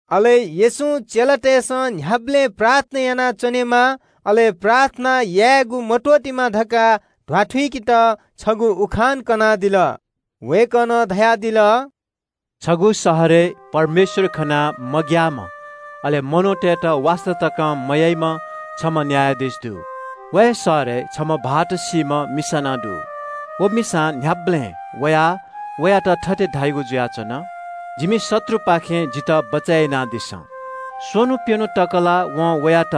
अले येशूं चेलातय्‌सं न्‍ह्याबलें प्रार्थना यानाच्‍वनेमा, अले प्रार्थना यायेगु मत्‍वःतेमा धकाः ध्‍वाथुइकेत छगू उखान कनादिल। वय्‌कलं धयादिल – “छगू शहरय् परमेश्‍वर खनाः मग्‍याःम्‍ह, अले मनूतय्‌त वास्‍ता तकं मयाइम्‍ह छम्‍ह न्‍यायाधीश दु। व हे शहरय् छम्‍ह भाःत सीधुंकूम्‍ह मिसा नं दु। व मिसां न्‍ह्याबलें वयाः वयात थथे धाइगु जुयाच्‍वन – ‘जितः क्‍वत्‍यलातःपिनिगु न्‍ह्यःने न्‍याय यानादिसँ।’ स्‍वन्‍हु प्‍यन्‍हु तक ला वं वयात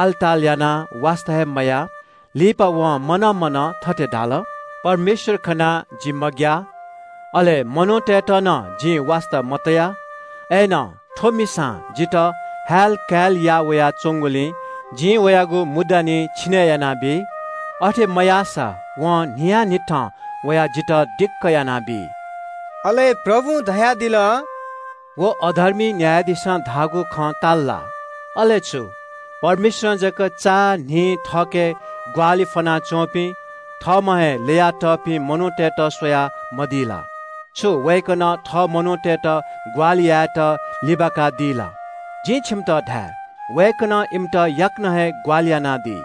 आलताल यानाः वास्‍ता हे मयाः। लिपा वं मनं मनं थथे धाल – ‘परमेश्‍वर खनाः जि मग्‍याः, अले मनूतय्‌त नं जिं वास्‍ता मतया। अय्‌नं थ्‍व मिसा जिथाय् यक्‍व हाः वयाच्‍वंगुलिं जिं वयागु मुद्दा निं छिने यानाबी। अथे मयाःसा वं न्‍हियान्‍हिथं वयाः जितः दिक्‍क यानाबी।’” अले प्रभुं धयादिल – “व अधर्मी न्‍यायाधीशं धाःगु खँ ताल ला? अले छु, परमेश्‍वरं जक चान्‍हि थःके ग्‍वाहालि फ्‍वनाच्‍वंपिं थःम्‍हं हे ल्‍ययातःपिं मनूतय्‌त स्‍वयामदी ला? छु वय्‌कलं थः मनूतय्‌त ग्‍वाहालि यायेत लिबाकादी ला? जिं छिमित धाये – वय्‌कलं इमित याकनं हे ग्‍वाहालि यानादी।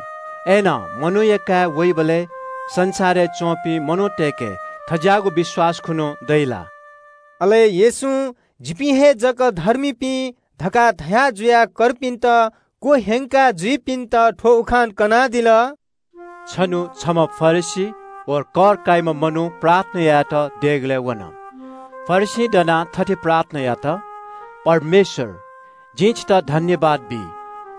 अय्‌नं मनूया काय् वइबलय् संसारय् च्‍वंपिं मनूतय्‌के थज्‍याःगु विश्‍वास खने दइ ला?” अले येशूं – “जिपिं हे जक धर्मीपिं” धकाः धया जुयाः कर्पिन्‍त क्‍वह्यंका जुइपिन्‍त थ्‍व उखान कनादिल – “छन्‍हु छम्‍ह फरिसी व कर काइम्‍ह मनू प्रार्थना यायेत देगलय् वन। फरिसीं दनाः थथे प्रार्थना यात – ‘परमेश्‍वर, जिं छितः सुभाय् बी,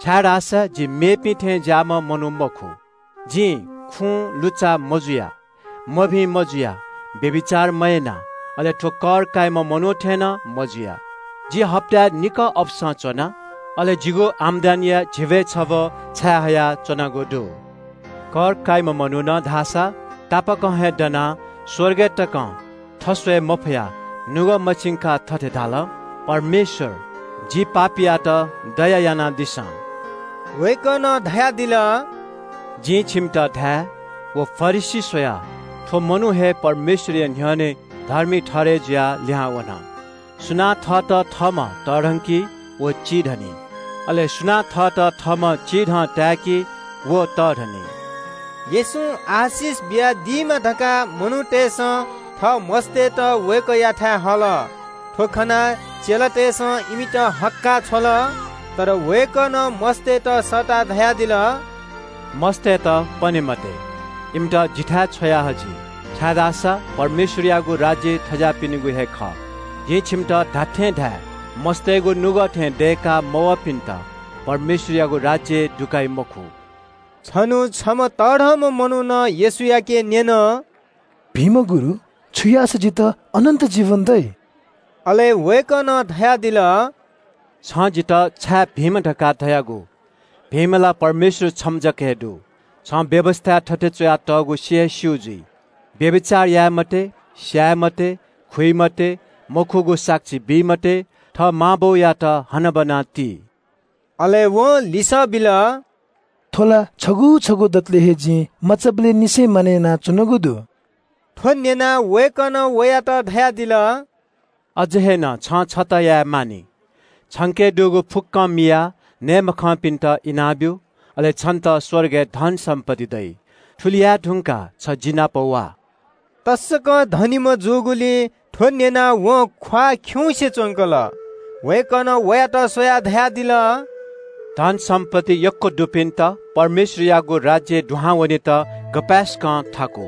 छाय्‌धाःसा जि मेपिं थें ज्‍याःम्‍ह मनू मखु। जि खुँ लुच्‍चा मजुया, मभिं मजुया, व्‍यभिचार मयाना, अले थ्‍व कर काइम्‍ह मनू थें नं मजुया। जि हप्‍ताय् निकः अपसं च्‍वना, अले जिं कमय् यानागु धिबां झिब्‍वय् छब्‍व छायेहया च्‍वनागु दु।’ “कर काइम्‍ह मनुखं धाःसा तापाकं हे दनाः स्‍वर्गय् तकं थस्‍वये मफयाः नुगः मछिंकाः थथे धाल – ‘परमेश्‍वर, जि पापीयात दया यानादिसँ।’” वय्‌कलं धयादिल – “जिं छिकपिन्‍त धाये – व फरिसी स्‍वयाः थ्‍व मनू हे परमेश्‍वरया न्‍ह्यःने धर्मी ठहरय् जुयाः लिहां वन। सुनां थःत थःम्‍हं तःधंकी व चिधनी। अले सुनां थःत थःम्‍हं चिधं ताय्‌की व तःधनी।” येशूं आशिष बियादीमा धकाः मनूतय्‌सं थः मस्‍तय्‌त वय्‌कःयाथाय् हल। थ्‍व खनाः चेलातय्‌सं इमित हक्‍काः छ्वल। अय्‌नं वय्‌कलं मस्‍तय्‌त सःताः धयादिल – “मस्‍तय्‌त पने मते, इमित जिथाय् छ्वया हजि, छाय्‌धाःसा परमेश्‍वरयागु राज्‍य थज्‍याःपिनिगु हे खः। जिं छिमित धात्‍थें धाये – मस्‍तय्‌गु नुगः थें दय्‌का मवःपिन्‍त परमेश्‍वरयागु राज्‍यय् दुकाइ मखु।” छन्‍हु छम्‍ह तःधंम्‍ह मनुखं येशूयाके न्‍यन – “भिंम्‍ह गुरु, छु याःसा जितः अनन्‍त जीवन दइ?” अले वय्‌कलं धयादिल – “छिं जितः छाय् भिंम्‍ह धकाः धयादियागु? भिंम्‍ह ला परमेश्‍वर छम्‍ह जक हे दु। छिं व्‍यवस्‍थाय् थथे च्‍वयातःगु सि हे स्‍यू जुइ – ‘व्‍यभिचार याये मते, स्‍याये मते, खुइ मते, मखुगु साक्षी बी मते, थः मां बौयात हनाबना ति।’” अले वं लिसः बिल – “थ्‍व ला छगू छगू दतले हे जिं मचाबलय् निसें मानय् याना वयाच्‍वनागु दु।” थ्‍व न्‍यनाः वय्‌कलं वयात धयादिल – “अझ हे नं छिं छता याये मानि। छिके दुगु फुक्‍कं मियाः नये मखंपिन्‍त इनाबियादिसँ, अले छितः स्‍वर्गय् धन-सम्‍पत्ति दइ। थुलि याये धुंकाः छि जि नाप झासँ।” तसकं तःमिम्‍ह जूगुलिं थ्‍व न्‍यनाः वं ख्‍वाः खिउँसे च्‍वंकल। वय्‌कलं वयात स्‍वयाः धयादिल – “धन-सम्‍पत्ति यक्‍व दुपिन्‍त परमेश्‍वरयागु राज्‍यय् दुहां वनेत गपाय्‌सकं थाकु।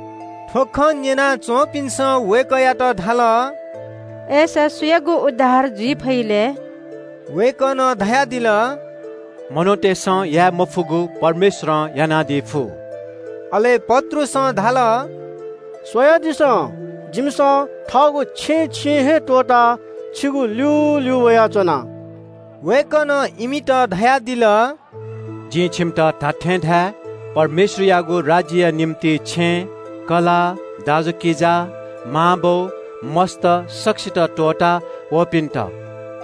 थ्‍व खँ न्‍यना च्‍वंपिन्‍सं वय्‌कःयात धाल – “अय्‌सा सुयागु उद्धार जुइ फइ लय्?” वय्‌कलं धयादिल – “मनूतय्‌सं याये मफुगु परमेश्‍वरं यानादी फु।” अले पत्रुसं धाल – “स्‍वयादिसँ, जिमिसं थःगु छेँछिँ हे त्‍वःताः छिगु ल्‍यूल्‍यू वयाच्‍वना।” वय्‌कलं इमित धयादिल – “जिं छिमित धात्‍थें धाये – परमेश्‍वरयागु राज्‍यया निंतिं छेँ, कलाः, दाजुकिजा, मांबौ, मस्‍त सकसित त्‍वःतावःपिन्‍त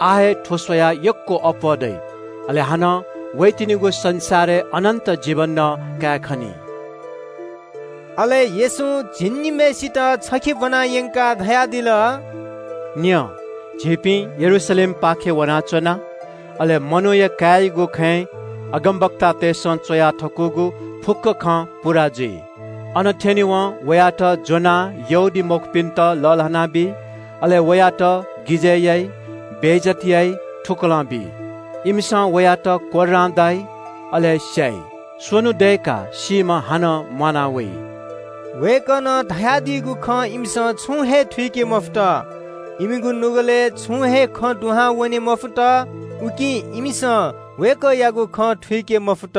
आः हे थ्‍व स्‍वयाः यक्‍वं अप्‍वः दइ, अले लिपा वइगु संसारय् अनन्‍त जीवन नं कायेखनी।” अले येशूं झिंनिम्‍हय्‌सित छखे ब्‍वना यंकाः धयादिल – “न्‍यँ, झीपिं यरूशलेमपाखे वनाच्‍वना। अन मनूया काय्‌यागु खँय् अगमवक्तातय्‌सं च्‍वया थकूगु फुक्‍क खँ पूवनी। अन थ्‍यनेवं वयात ज्‍वनाः यहूदीमखुपिन्‍त लःल्‍हानाबी, अले वयात गिजय् याइ, बेइज्‍जत याइ, थुकलं बी। इमिसं वयात कोर्रां दाइ, अले स्‍याइ। स्‍वन्‍हु दय्‌काः सीम्‍हं हानं म्‍वाना वइ।” वय्‌कलं धयादीगु खँ इमिसं छुं हे थुइके मफुत। इमिगु नुगलय् छुं हे खँ दुहां वने मफुत। उकिं इमिसं वय्‌कःयागु खँ थुइके मफुत।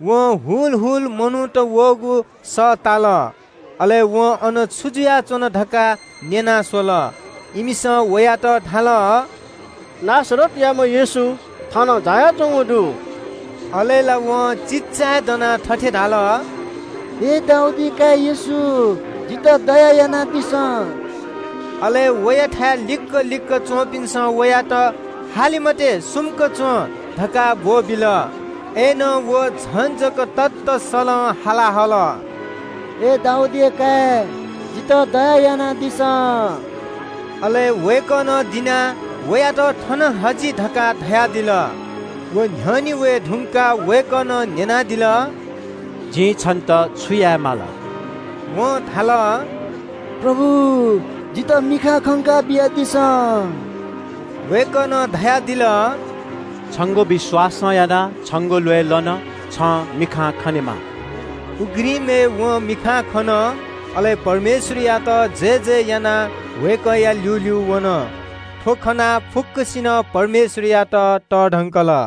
वं ग्‍वाः ग्‍वाः मनूत वःगु सः ताल। अले वं अन छु जुयाच्‍वन धकाः न्‍यना स्‍वल। इमिसं वयात धाल – “नासरतयाम्‍ह येशू थनं झायाच्‍वंगु दु।” अले ला वं चिल्‍लाय् दनाः थथे धाल – “अय् दाऊदया काय् येशू, जितः दया यानादिसँ।” अले वयाथाय् लिक्‍क लिक्‍क च्‍वंपिन्‍सं वयात “हाले मते, सुम्‍क च्‍वँ” धकाः ब्‍वःबिल। अय्‌नं व झन जक ततःसलं हाला हल – “अय् दाऊदया काय्, जितः दया यानादिसँ।” अले वय्‌कलं दिनाः वयात “थन हजि” धकाः धयादिल। व न्‍ह्यःने वये धुंकाः वय्‌कलं न्‍यनादिल – “जिं छन्‍त छु याये माल?” वं धाल – “प्रभु, जितः मिखां खंका बियादिसँ।” वय्‌कलं धयादिल – “छंगु विश्‍वासं यानाः छंगु ल्‍वय् लन, छं मिखां खनेमा।” उघ्रिमय् वं मिखां खन। अले परमेश्‍वरयात जयजय यानाः वय्‌कःया ल्‍यूल्‍यू वन। थ्‍व खनाः फुक्‍कसिनं परमेश्‍वरयात तःधंकल।